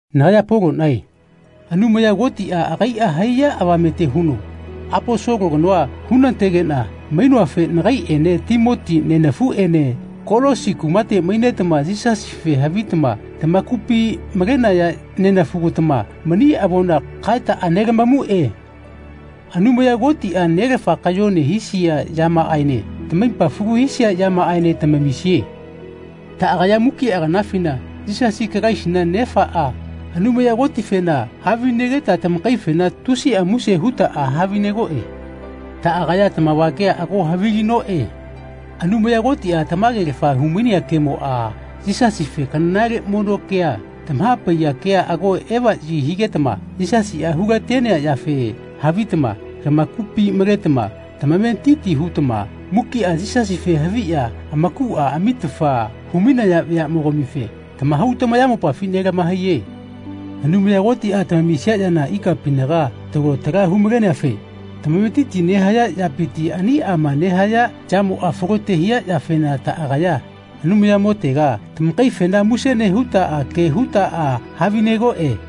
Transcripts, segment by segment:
Nagaya Poloꞌnae Anumaya Kotiꞌa agaiꞌa haiya avamete huno Aposolo kanoa hunatenegeꞌna mainoafe nagaiꞌene Timoti nenafuꞌene Kolosi kumate mainetama Yisasife havitama tamakupi malenaya neꞌafugatama mani avona kaetaꞌa nelamamuꞌe. Anumaya Kotiꞌa Nelafa kayone hisia yamaꞌaene tamaipa falu hisia yamaꞌaene tamamisie. Taꞌagaya mukiꞌa kanafina Yisasi Kalaisina Nefaꞌa, Anumaya Kotifena havinegeta tamakaifena tusiꞌa muse hutaꞌa havinegoꞌe. Taꞌagaya tamavagea ago havilinoꞌe. Anumaya Kotiꞌa tamagelafa humainea kemoꞌa, Yisasife kanale mono kea, tamahapaiya kea ago evaꞌyi higetama Yisasiꞌa hulatenea yafe havitama tamakupi maletama tamametiti hutama mukiꞌa Yisasife haviꞌya amakuꞌa amitafa humainaya veaꞌmogamife tamahau tamayamopafi nelamahaiye. Anumaya Kotiꞌa tamamisia yana ikapinaga talo tala humaleneafe tamametiti nehaya yapiti aniꞌama nehaya yamoꞌa falote hia yafena taꞌagaya Anumayamotega tamakaifena muse nehutaꞌa ke hutaꞌa havinegoꞌe.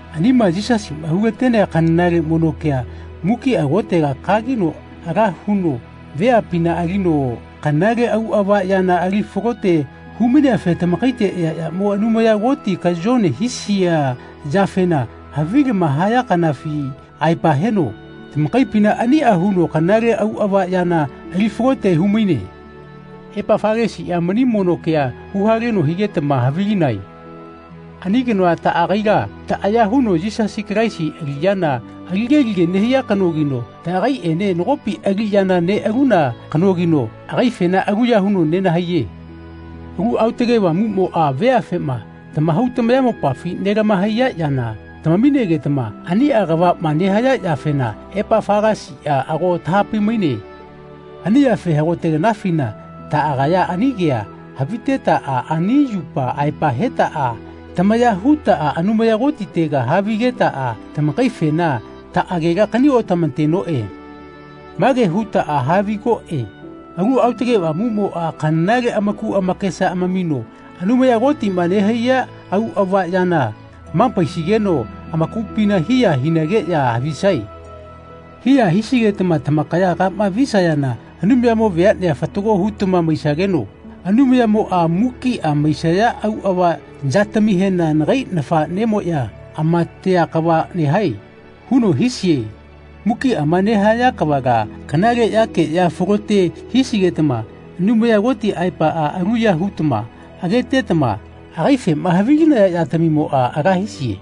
Anima Yisasiꞌa hulatenea kanale mono kea mukiꞌa kotega kagino ala huno veapina alino kanale auꞌava yana ali falote humaineafe tamakaite eaꞌamo Anumaya Koti kayone hisia yafema havilama haya kanafi aepa heno tamakaipina aniꞌa huno kanale auꞌava yana ali falote humaine. Epafalasiꞌa mani mono kea huhaleno higetama havilinae. Ani kanoa taꞌagaila taꞌaya huno Yisasi Kalaisi aliꞌyana alige alige nehia kanogino taꞌagaiꞌene nagopi aliꞌyana neꞌaluna kanogino agaifena aluya huno nenahaiye. Alu Aotage Avamuꞌmoꞌa veafema tamahau tamayamopafi nelahamaiya yana tamaminegetama aniꞌa kavaꞌma nehaya yafena Epafalasiꞌa ago taꞌahapai-maine. Ani yafe hagote kanafina taꞌagaya ani kea havitetaꞌa ani yupa aepa hetaꞌa tamaya hutaꞌa Anumaya Kotitega havigetaꞌa tamakaifena taꞌagela kaniotamatenoꞌe. Mage hutaꞌa havigoꞌe “Alu Aotage Avamuꞌmoꞌa kanale amaku amakesa amamino Anumaya Kotiꞌma nehaiya auꞌava yana hamapaisigeno amakupina hiya hinageꞌya havisae. Hiya hisigetama tamakaya kama vaiyesayana Anumayamo veaꞌne fatago hutama maisageno Anumayamoꞌa mukiꞌa maisaya auꞌava yatamihena ‘Nagai nafaꞌnemoꞌya amatea kava nehae.’ huno haisie. Mukiꞌama nehaya kavala kanale yakeꞌya falote hisigetama Anumaya Koti aepaꞌa aluya hutama agetetama agaifema havilinaya yatamimoꞌa ala hisie.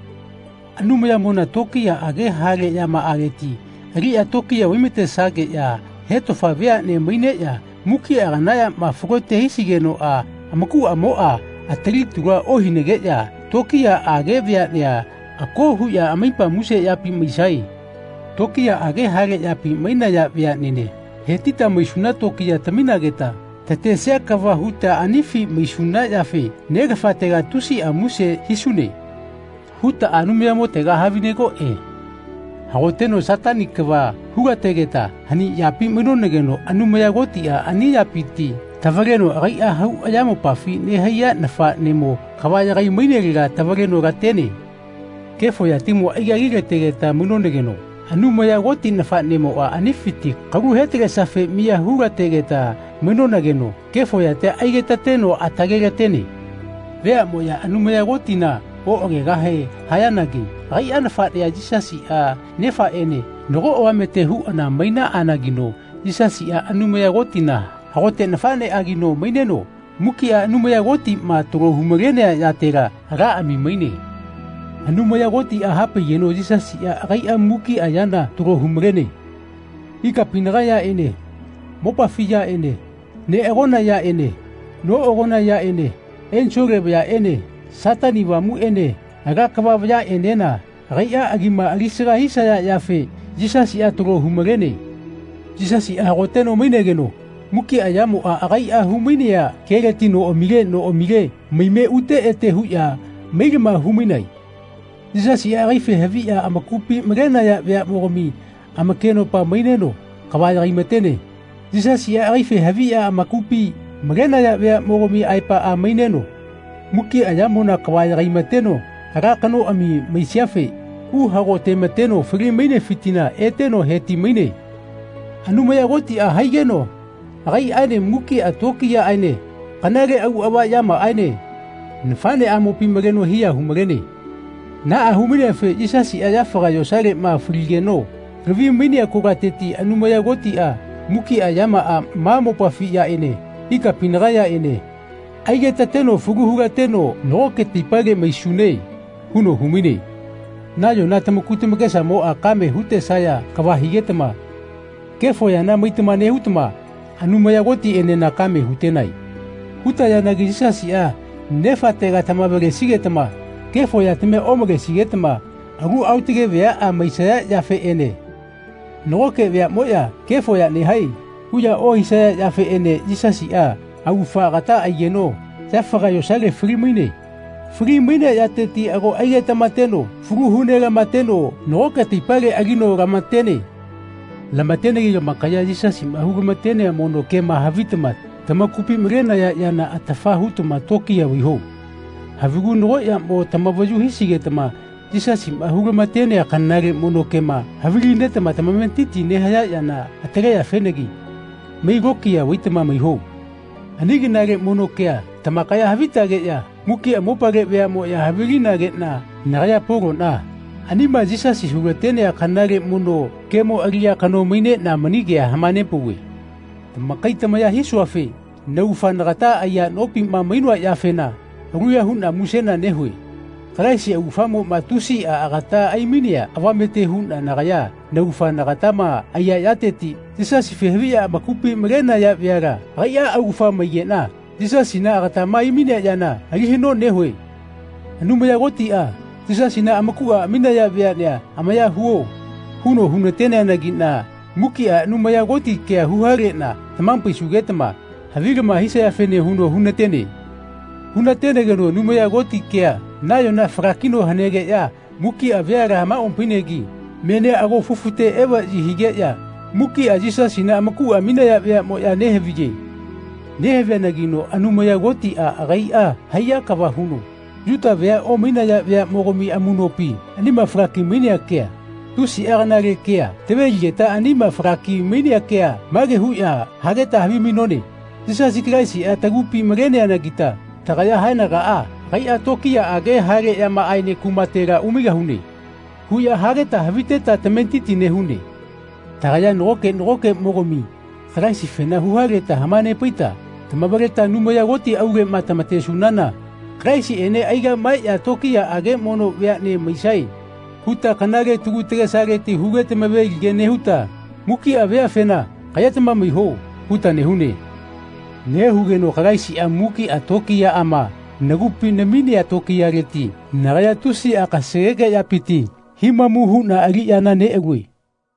Anumayamona tokiyaꞌage hale yamaꞌaleti aliꞌya tokiya vaimatesageꞌya hetofa veaꞌne maineꞌya mukiꞌa kana yama falote hisigenoꞌa amakuꞌamoꞌa atali talua ohinageꞌya tokiyaꞌage veaꞌne ako huꞌya amaipa muse yapi maisae. Tokiyaꞌage hale yapi mainaya veaꞌnene hetita maisuna tokiya taminageta tatesia kava huta anifi maisuna yafe Nelafatega tusiꞌa muse hisune.” hutaꞌa Anumayamotega havinegoꞌe. Hagoteno Satani kava hulategeta hani yapi mainonageno Anumaya Kotiꞌa ani yapiti tavaleno agaiꞌa hau ayamopafi nehaiya nafaꞌnemo kava yagai-mainelega tavaleno latene. Kefo yatimo aigagilategeta mainonageno Anumaya Koti nafaꞌnemoꞌa anifiti kalu he-talesiafe miya hulategeta mainonageno kefo yatia aigetateno atale-latene. Veaꞌmoꞌya Anumaya Kotina oꞌagegahe hayanagi agaiꞌa nafaꞌnea Yisasiꞌa Nefaꞌene nago avamete huꞌana mainaꞌanagino Yisasiꞌa Anumaya Kotina hagote nafaꞌneꞌagino maineno mukiꞌa Anumaya Kotiꞌma talo humalenea yatela alaꞌami maine. Anumaya Kotiꞌa hapaigeno Yisasiꞌa agaiꞌa mukiꞌa yana talo humalene. Ikapinaga yaꞌene mopafi yaꞌene neꞌagona yaꞌene noꞌagona yaꞌene ensole vayaꞌene Satani Avamuꞌene ala kava vayaꞌenena agaiꞌa agima alisaga hisaya yafe Yisasiꞌa talo humalene. Yisasiꞌa hagoteno mainegeno mukiꞌa yamoꞌa agaiꞌa humainea keleti noꞌamile noꞌamile maime ute ete huꞌya mailama humainae. Yisasiꞌa agaife haviꞌya amakupi malenaya veaꞌmogami amakenopa maineno kava yagaimatene. Yisasiꞌa agaife haviꞌya amakupi malenaya veaꞌmogami aepaꞌa maineno mukiꞌa yamona kava yagaimateno ala kanoꞌami maisiafe uhagotemateno fali-mainefitila eteno heti-maine. Anumaya Kotiꞌa haigeno agaiꞌaene mukiꞌa tokiyaꞌaene kanale auꞌava yamaꞌaene nafaꞌneꞌamopi maleno hiya humalene. Naꞌa hu-maineafe Yisasiꞌa yafaga yosaleꞌma faligeno lavi-mainea kolateti Anumaya Kotiꞌa mukiꞌa yamaꞌa ma mopafi yaꞌene ikapinaga yaꞌene aigetateno falu hulateno “Nagoke taipale maisune.” huno humaine. Nayona tamaku tamakesamoꞌa kame hutesaya kava higetama kefo yana maitama nehutama Anumaya Kotiꞌenena kame hutenae. Hutayanagi Yisasiꞌa Nefatega tamavalesigetama kefo yatamia omalesigetama alu aotage veaꞌa maisaya yafeꞌene nagoke veaꞌmoꞌya “Kefo ya nehae.” huꞌya ohisaya yafeꞌene Yisasiꞌa augafa agata aigeno yafaga yosale fali-maine. Fali-mainea yateti ago aigetamateno falu hu-nelamateno nagoke taipale alino lamatene. Lamatenegi tamakaya Yisasiꞌma hulamatenea mono kema havitama tamakupi malenaya yana atafa hutama tokiya vaiho. Havigu nago yamo tamavayu hisigetama Yisasiꞌma hulamatenea kanale mono kema havilinetama tamametiti nehaya yana ataleyafenagi mai lokiya vaitama maiho. Ani kanale mono kea tamakaya havitageꞌya mukiꞌa mopale veaꞌmoꞌya havilinageꞌna nagaya Poloꞌna anima Yisasi hulatenea kanale mono kemo aliꞌya kano maineꞌna mani kea hamanepauve. Tamakai tamaya hisuafe naugafa nagata aiya nopima mainoa yafena aluya huꞌna musena nehue. Kalaisi augafamoꞌma tusiꞌa agata aimainea avamete huꞌna nagaya naugafa nagatama aiya yateti Yisasife haviꞌya amakupi malenaya veala agaiꞌa augafa maigeꞌna Yisasina agatama aimainea yana alivaya nehue. Anumaya Kotiꞌa “Yisasina amakuꞌa aminaya veaꞌnea amaya huo.” huno hunateneanagiꞌna mukiꞌa Anumaya Koti kea huhaleꞌna tamahapaisugetama havilama hisayafene huno hunatene. Hunatenegeno Anumaya Koti kea nayona falakino hanegeꞌya mukiꞌa veala hamaopainagi menia ago fufute evaꞌyi higeꞌya mukiꞌa Yisasina amakuꞌa aminaya veaꞌmoꞌya nehaviye. Nehaviyanagino Anumaya Kotiꞌa agaiꞌa haiya kava huno Yuta vea omainaya veaꞌmogami amuꞌnopi anima falaki-mainea kea, tusiꞌa kanale kea, taveligeta anima falaki-mainea kea mage huꞌya hageta havimainone “Yisasi Kalaisiꞌa tagupi maineanagita tagaya haenagaꞌa agaiꞌa tokiyaꞌage hale yamaꞌaene kumatela umaigahune.” huꞌya hageta haviteta tametitia nehune. Tagaya nagoke nagokeꞌmogami Kalaisifena huhaleta hamanepaita tamavaleta Anumaya Koti auleꞌma tamatesunana Kalaisiꞌene aigaꞌmaeꞌya tokiyaꞌage mono veaꞌne maisae huta kanale tagu tagesaleti huge tamaveligea nehuta mukiꞌa veafena “Kaꞌyetama maiho.” huta nehune. Nehugeno Kalaisiꞌa mukiꞌa tokiyaꞌama nagupi naminea tokiyaleti nagaya tusiꞌa kasageke yapiti himamu huꞌna aliꞌyana neꞌalue.